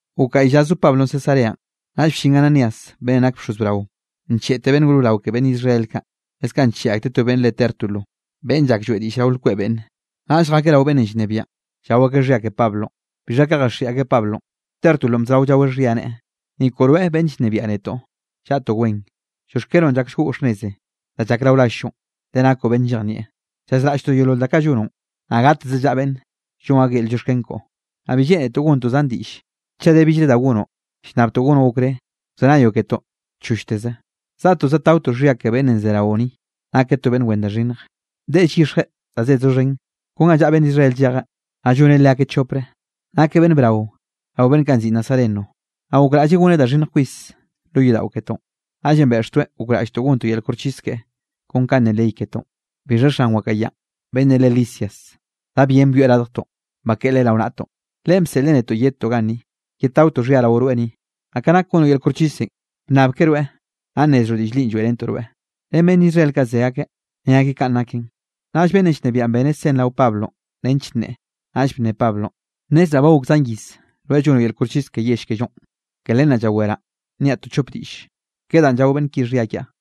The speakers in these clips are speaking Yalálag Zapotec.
Gok gaꞌy lla zo Pablonꞌ Cesareanꞌ, naꞌll bllin Ananías beꞌnnenꞌ nak bxoz brao, ncheꞌteꞌ beꞌnn gor brao ke beꞌnn Israel kaꞌ, leskaꞌ ncheꞌe akteꞌ to beꞌnn re Tértulo beꞌnn llak lloeꞌ diꞌll rao lkweꞌ beꞌnne. Naꞌll jakeꞌ rao beꞌnnenꞌ llnebiaꞌn, llao akeꞌ xhia ke Pablonꞌ. Bixha ka jaxiꞌi akeꞌ Pablonꞌ, Tértulonꞌ bzorao llaweꞌ xhia, neꞌe: —Ni koꞌo rweꞌ, beꞌnn llnebiaꞌ netoꞌ, llaꞌtoꞌ wen, llioxkenoꞌn llak llgoꞌ xhnnez danꞌ llak rao rall-llo, le nakoꞌ beꞌnn llejnieꞌ. Llazraꞌlltoꞌ yeolol da kaꞌ llonoꞌn, naꞌ gateze llaꞌa beꞌnn llonn akeꞌ yel llioxken koꞌo. Naꞌ bi lleꞌnetoꞌ gontoꞌ zan diꞌll chaꞌ de billre da gonoꞌ, llnnabtoꞌ gonoꞌ okré wzenayoꞌ ketoꞌ chollteze. Zaꞌtoꞌ zadtaotoꞌ xhia ke beꞌnnenꞌ ze raoꞌ ni, nakeꞌ to beꞌnn wen da xhinnj, deꞌe llyixjeꞌ da zed doxhen, kon ga llaꞌa beꞌnn Israel llejeꞌ, naꞌ lloneꞌ leakeꞌ chopre. Nakeꞌ beꞌnn brao rao beꞌnn kaꞌ nziꞌi Nazareno. Naꞌ gokraꞌlleꞌ goneꞌ da xhinnj kwis lo yodaꞌo ketoꞌn. Naꞌllenꞌ beꞌxtoeꞌ gokraꞌlltoꞌ gontoꞌ yel koxchis keꞌe kon kanꞌ ne ley ketoꞌn. Bixha xan wakaꞌa yanꞌ beꞌnnenꞌ re Lisias, da bien byoeꞌ radjtoꞌn, bakeꞌe leꞌe rao naꞌtoꞌn. Leꞌen bseꞌleꞌ netoꞌ yedtoꞌ ganni, yedtaotoꞌ xhia rao rweꞌ ni. Naꞌ ka nak gonoꞌ yel koxchisenꞌ, wnnabke rweꞌ, naꞌ nnezroꞌ diꞌll linꞌ lloeꞌrentoꞌ rweꞌ. Ren beꞌnn Israel kaꞌ ze akeꞌ, ne akeꞌ kaꞌn naken. Naꞌll beꞌnnenꞌ llnebiaꞌn beneꞌ sen rao Pablonꞌ nench nneꞌe. Naꞌll bne Pablonꞌ: —Nnezraꞌ ba gok zan iz rweꞌ llonoꞌ yel koxchis ke yell kellonꞌ, ke len naꞌ llaweraꞌ niaꞌ to chop diꞌll ke danꞌ llao beꞌnn ki xhia kiaꞌ.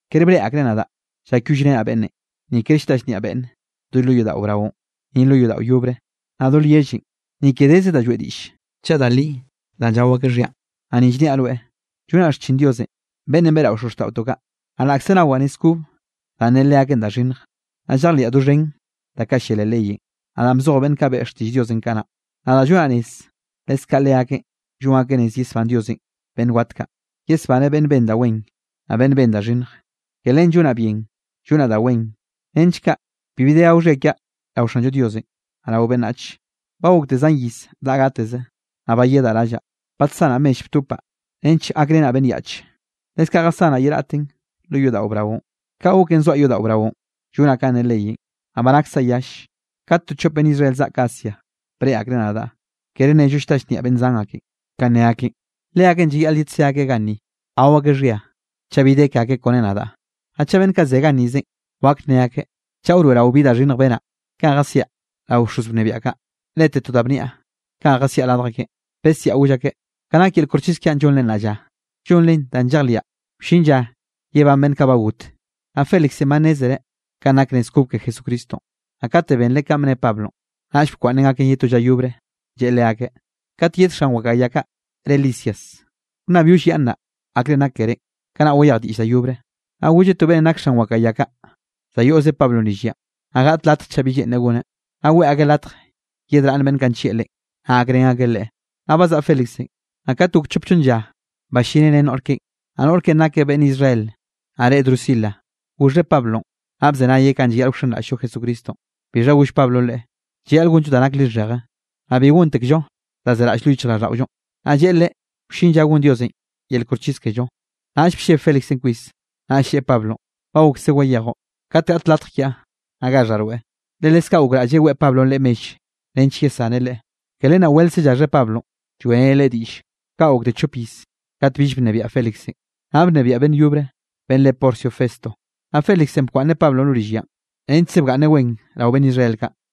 Kere breꞌe akreꞌ nadaꞌ llakyollrenaꞌ beꞌnne, ni ker llta llnniaꞌ beꞌnne do lo yodaꞌo braonꞌ, ni lo yodaꞌo yobre, naꞌ do lyellenꞌ. Ni ke deze da lloeꞌ diꞌll chaꞌ da li danꞌ llao akeꞌ xhianꞌ. Naꞌ ni llniaꞌ rweꞌ, llonaꞌ xchin Diosenꞌ beꞌnn beꞌrao xozxtaꞌotoꞌ kaꞌ, naꞌ laꞌkze nawaꞌ nez kob danꞌ ne leakeꞌn da xhinnj, naꞌ llejliaꞌ doxhen da kaꞌ llia leꞌ leyenꞌ, naꞌ danꞌ bzoj beꞌnn kaꞌ beꞌe xtiꞌll Diosenꞌ kanaꞌ. Nadaꞌ llonaꞌ rez, leskaꞌ leakeꞌn llon akeꞌ rez yesbán Diosenꞌ beꞌnn wat kaꞌ, yesbaneꞌ beꞌnn ben da wen naꞌ beꞌnn ben da xhinnj. Ke len llonaꞌ bien llonaꞌ da wen nench kaꞌ bibi de gao xhia kiaꞌ rao Xanllo Dios, naꞌ rao beꞌnnach. ’Ba gokte zan iz daꞌa gateze, naꞌ bayedaꞌ rallaꞌ, badsanaꞌ mell btopaꞌ nench gakrenaꞌ beꞌnn yaꞌche, leskaꞌ jasanaꞌ ye raꞌtenꞌ lo yodaꞌo braonꞌ. Ka goken zoaꞌ yodaꞌo braonꞌ llonaꞌ kanꞌ ne leyenꞌ, naꞌ ba naksaꞌ yall, kat to chop beꞌnn Israel zaꞌk Asia breꞌe akreꞌ nadaꞌ, kere nello llta llnniaꞌ beꞌnn zan ake, kanꞌ ne akeꞌn. Leakeꞌn llayaꞌl yedsé akeꞌ ganni gao akeꞌ xhia, chaꞌ bi de ke akeꞌ kone nadaꞌ. Naꞌ chaꞌ beꞌnn kaꞌ ze gannizenꞌ wak nne akeꞌ chaꞌ wroeꞌrao bi da xhinnj benaꞌ kanꞌ jasiaꞌ rao bxoz wnebiaꞌ kaꞌ. Lete to da bniaꞌ kanꞌ jesiaꞌ radj akeꞌn, besiaꞌ goll akeꞌ: “Ka nak yel koxchis kiaꞌn llonre nnaꞌ lla, llonren danꞌ llejliaꞌ wllin lla yebán beꞌnn kaꞌ ba got.” Naꞌ Félixenꞌ ba nnezreꞌ kanꞌ nak nez kob ke Jesucristonꞌ, naꞌ kate benreꞌ kanꞌ bne Pablonꞌ, naꞌll bkwaꞌnneꞌn gaken ye to lla yobre, lleꞌe leakeꞌ: —Kat yed xan wakaꞌa ya kaꞌ re Lisias, wnnabyollyaꞌnnaꞌ akrenꞌ nak kerénꞌ, kanaꞌ wayej diꞌll da yobre. Naꞌ golleꞌ to beꞌnnenꞌ nak xan wakaꞌa ya kaꞌ, za yoꞌz Pablonꞌ rill yanꞌ, naꞌ gaꞌt latj chaꞌ bi lleꞌnreꞌ goneꞌ, naꞌ weꞌe latj yedraꞌnn beꞌnn kaꞌ nllieꞌ leꞌen, naꞌ gakrén akeꞌ leꞌe. Naꞌ bazaꞌa Félixenꞌ, naꞌ kat gok chop chonn lla ballineꞌ ren noꞌr keꞌe, naꞌ noꞌr keꞌen nakeꞌ beꞌnn Israel naꞌ re Drusila. Goxheꞌ Pablonꞌ, naꞌ bzenayeꞌ kanꞌ llayaꞌl wxenraꞌll-llo Jesucristonꞌ. Bixha goll Pablonꞌ leꞌe, llayaꞌl gonllo da nak lixheje, naꞌ bi gontekllo danꞌ zeraꞌll lo yichjraꞌlldaꞌollonꞌ, naꞌ lleꞌe leꞌe wllin lla gon Diosenꞌ yel koxchis kello. Naꞌll blleb Félixenꞌ kwis, naꞌll lleꞌe Pablonꞌ: —Ba gokse wayejoꞌ. Kat gaꞌt latj kiaꞌ, naꞌ gaxhaꞌ rweꞌ. Le leskaꞌ gokraꞌlleꞌ weꞌe Pablonꞌ leꞌe mell nench yesaneꞌ leꞌe, ke len weltze llaxheꞌ Pablonꞌ lloeꞌreneꞌ leꞌe diꞌlle. Kaꞌ gokte chop iz, kat bill bnebiaꞌ Félixenꞌ, naꞌ bnebiaꞌ beꞌnn yobre beꞌnn re Porcio Festo. Naꞌ Félixenꞌ bkwaꞌnneꞌ Pablonꞌ lo rill yanꞌ, nechkze bgaꞌnneꞌ wen rao beꞌnn Israel kaꞌ.